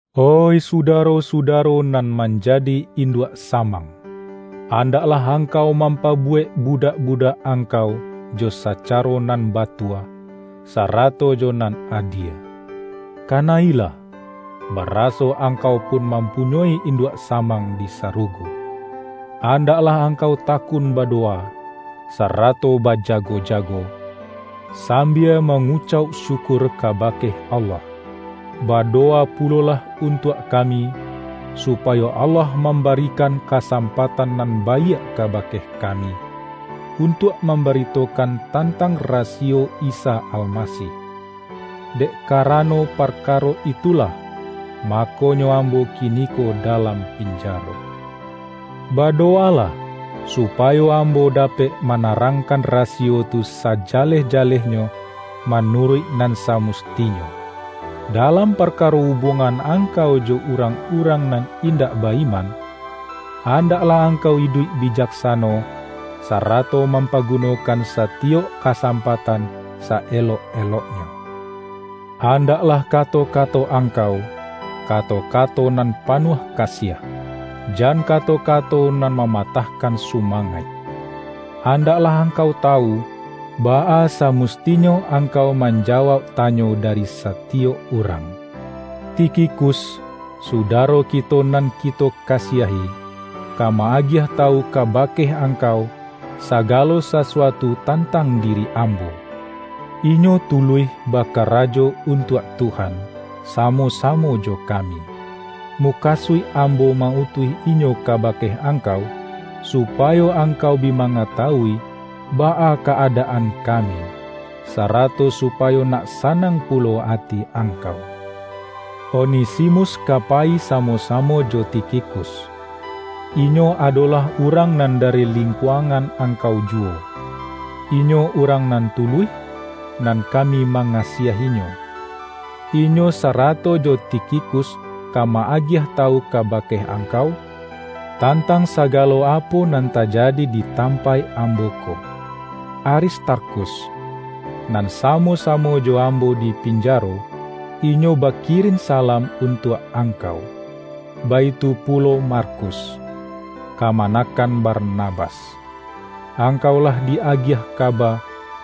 Oih sudaro-sudaro nan manjadi induak samang! Andaklah angkau mampabuwek budak-budak angkau jo sacaro nan batua, sarato jo nan adie. Kana-ilah, baraso angkau pun mam-punyoi induak samang di sarugo. Andaklah angkau takun badowa, sarato bajago-jago, sambia mangucauk syukur kabake Allah. Badowa pulo-lah untuak kami, supayo Allah mam-barikan kasampatan nan baiak kabake kami, untuak mambaritokan tantang rasiyo Isa Almasih. Dek karano par-karo itulah, makonyo ambo kiniko dalam pinjaro. Badowalah, supa-yo ambo dapek manarangkan rasiyo tu sajaleh-jalehnyo manuruik nan sa-mustinyo. Dalam parkaro ubuangan angkau jo urang-urang nan indak ba-iman, andaklah angkau iduik bijaksano, sa-rato mampagunokan satiyok kasam-patan sa-elok-eloknyo. Andaklah kato-kato angkau, kato-kato nan pa-nuah kasiah, jan kato-kato nan mama-tahkan sumangaik. Andaklah angkau tawu, baa samustinyo angkau manja-wauk tanyo dari satiyok urang. Tikhikus, sudaro kito nan kito ka-siahi, ka ma-agiah tawu kabake ang-kau sagalo sasuatu tantang diri ambo. Inyo tuluih bakarajo untuak Tuhan, samo-samo jo kami. Mukasuik am-bo ma-utuih inyo kabake angkau, supayo angkau bi mangatawui baa ka-adaan kami, sarato supayo nak sanang pulo ati angkau. Onesimus ka payi samo-samo jo Tikhikus; inyo adolah urang nan dari lingkuangan angkau juwo. Inyo urang nan tuluih, nan kami mangasiahinyo. Inyo sara-to jo Tikhikus ka ma-agiah tawu ka-bake angkau, tantang sagalo apo nan tajadi di tampaik ambo ko. Aristarkhus, nan samo-samo jo ambo di pinjaro, inyo bakirin salam untuak angkau. Baitu pulo Markus, kamanakan Barnabas. (Angkau lah di-agiah kaba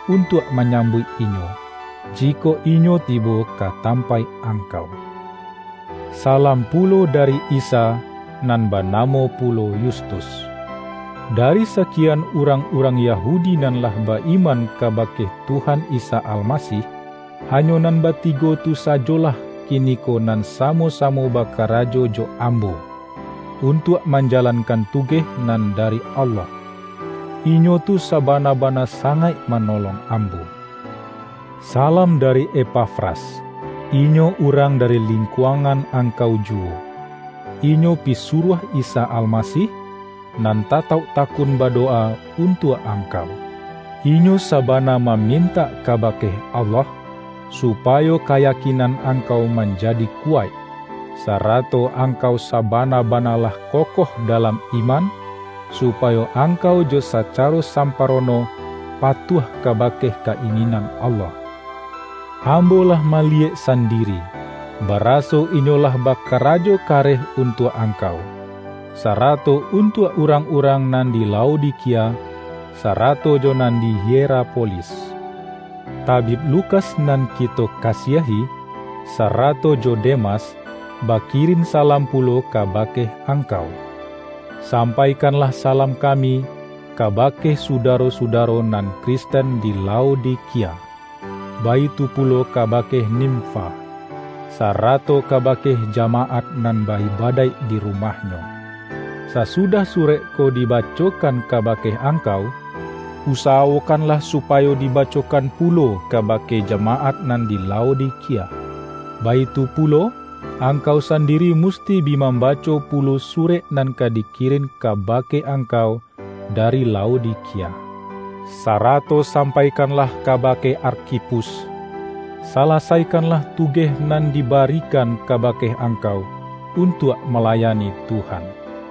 untuak manyambuik inyo, jikok inyo tibo ka tampaik ang-kau.) Salam pulo dari Isa, nan ba-namo pulo Yustus. Dari sakian urang-urang Yahudi nan lah ba-iman kabake Tuhan Isa Almasih, hanyo nan batigo tu sajolah kiniko nan samo-samo ba-karajo jo ambo, untuak manjalankan tugeh nan dari Allah. Inyo tu sabana-bana sangaik manolong ambo. Salam dari Epafras. Inyo urang dari lingkuangan angkau juwo. Inyo pisuruah Isa Almasih, nan tatauk ta-kun badowa untuak angkau. Inyo sa-bana mamintak kabake Allah, supayo kayakinan angkau manjadi kuwaik, sarato angkau sabana-bana lah kokoh dalam iman, supayo angkau jo sacaro samparono patuah kabake ka-ingin-an Allah. Ambo lah maliyek san-diri, baraso inyo lah bakarajo kareh untuak angkau, sarato untuak urang-urang nan di Laodikia, sarato jo nan di Hierapolis. Tabib Lukas nan ki-to kasiahi, sarato jo Demas, bakirin salam pulo kabake angkau. Sampaikanlah salam kami, kaba-ke sudaro-sudaro nan Kristen di Lao-dikia; baitu pulo kabake Nimfa, sara-to kabake jamaat nan ba-ibadaik di rumahnyo. Sasudah surek ko diba-cokan kabake angkau, usawokanlah supayo dibacokan pulo kabake jama-at nan di Laodikia. Baitu pulo, angkau sandiri musti bi mambaco pulo surek nan ka dikirin kabake angkau dari Laodikia. Sarato sampaikan-lah kabake Arkhipus,”Salasaikanlah tugeh nan dibarikan kabake angkau untuak malayani Tuhan.”